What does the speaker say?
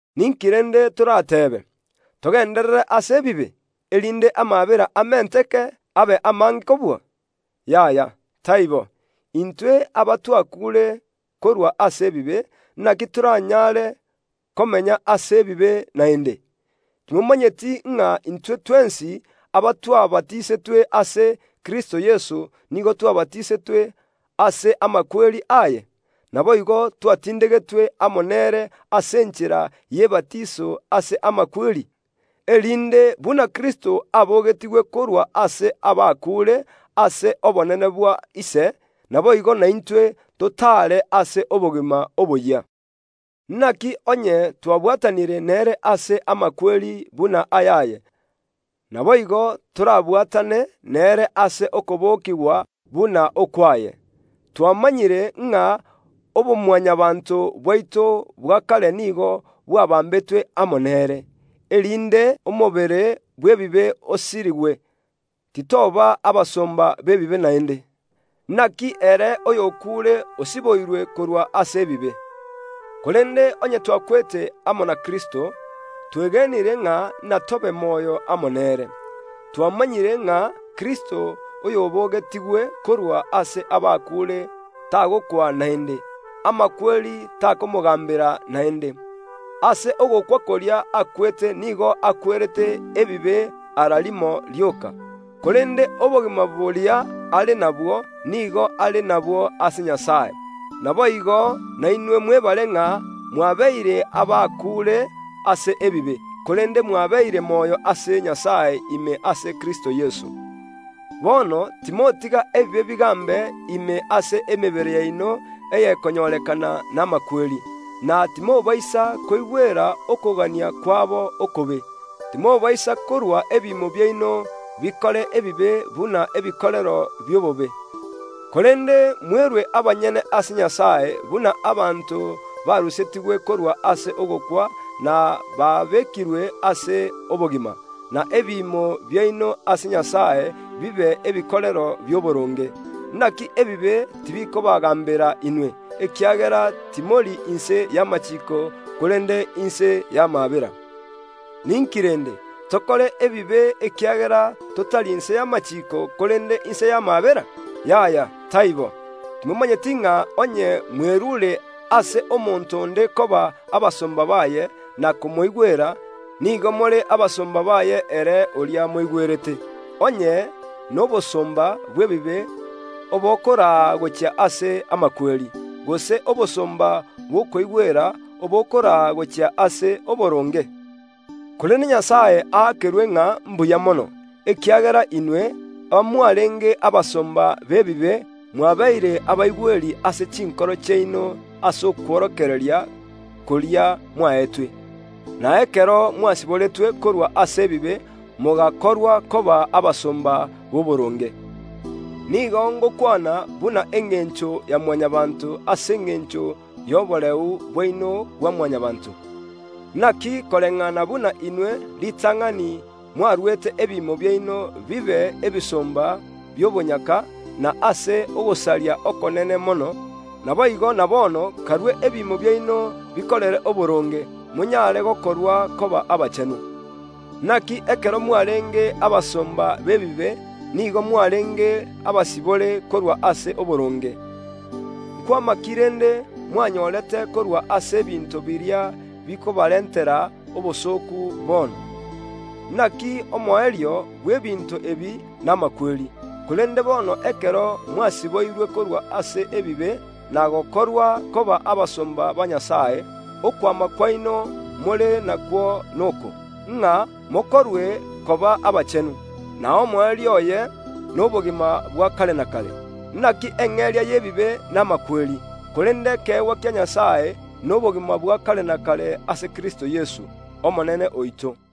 Ninki rende torateebe? Togenderere ase ebibe, erinde amaabera amenteke abe amange kobua? Yaya, taibo! Intwe abatwakuure korwa ase ebibe, inaki toranyare komenya ase ebibe naende? Timomanyeti ng’a intwe twensi abatwabatisetwe ase Kristo Yeso nigo twabatisetwe ase amakweri aye? Naboigo twatindegetwe amo nere ase enchera y’ebatiso ase amakweri, erinde buna Kristo abogetigwe korwa ase abakuure ase obonene bwa Ise, naboigo naintwe, totaare ase obogima oboyia. Inaki onye twabwatanire nere ase amakweri buna ayaye, naboigo torabwatane nere ase okobokigwa buna ok’waye. Twamanyire ng’a obo Mwanyabaanto bwaito bwa kare nigo bwabambetwe amo nere, erinde omobere bw’ebibe osirigwe, titoba abasomba b’ebibe naende. Inaki ere oy okuure osiboirwe korwa ase ebibe. Korende onye twakwete amo na Kristo, twegenire ng’a inatobe moyo amo nere. Twamanyire ng’a Kristo oyobogetigwe korwa ase abakuure tagokwa naende; amakweri takomogaambera naende. Ase ogokwa koria akwete nigo akwerete ebibe ara rimo rioka, korende obogima boria are nabwo nigo are nabwo ase Nyasae. Naboigo nainwe mwebare ng’a mwabeire abakuure ase ebibe, korende mwabeire moyo ase Nyasae ime ase Kristo Yeso. Bono timotiga ebibe bigaambe ime ase emebere yaino ey’ekonyorekana n’amakweri, na timobaisa koigwera okogania kwabo okobe. Timobaisa korua ebiimo biaino bikore ebibe buna ebikorero bi’obobe, korende mwerue abanyene ase Nyasae buna abanto barusetigwe korwa ase ogokwa na babekirwe ase obogima, na ebiimo biaino ase Nyasae bibe ebikorero bi’oboronge. Inaki ebibe tibikobaagaambera inwe, ekiagera timori inse y’amachiiko korende inse y’amaabera. Ninki rende? Tokore ebibe ekiagera totari inse y’amachiiko korende inse y’amaabera? Yaya taibo! Timomanyeti ng’a onye mwerure ase omonto onde koba abasomba baye na komoigwera, nigo more abasomba baye ere oria moigwerete, onye n’obosomba bw’ebibe obokoraa gochia ase amakweri, gose obosomba bw’okoigwera obokoraa gochia ase oboronge? Korende Nyasae aakerwe ng’a mbuya mono, ekiagera inwe, abamwarenge abasomba b’ebibe, mwabeire abaigweri ase chinkoro chiaino ase okworokereria koria mwaetwe, na ekero mwasiboretwe korwa ase ebibe mogakorwa koba abasomba b’oboronge. Nigo ngokwana buna engencho ya Mwanyabaanto ase engencho y’oboreu bwaino bwa Mwanyabaanto, Inaki koreng’ana buna inwe ritang’ani mwaruete ebiimo biaino bibe ebisomba bi’obonyaka na ase ogosaria okonene mono, naboigo na bono karue ebiimo biaino bikorere oboronge, monyare gokorwa koba abachenu. Inaki ekero mwarenge abasomba b’ebibe nigo mwarenge abasibore korwa ase oboronge. Nkwama ki rende mwanyorete korwa ase ebinto biria bikobarentera obosooku bono? Inaki omoerio bw’ebinto ebi n’amakweri. Korende bono ekero mwasiboirwe korwa ase ebibe na gokorwa koba abasomba ba Nyasae, okwama kwaino more nakwo noko, ng’a mokorwe koba abachenu, na omoerio oye nobogima bwa kare na kare. Inaki eng’eria y’ebibe n’amakweri, korende ekeegwa kia Nyasae nobogima bwa kare na kare ase Kristo Yeso, Omonene oito.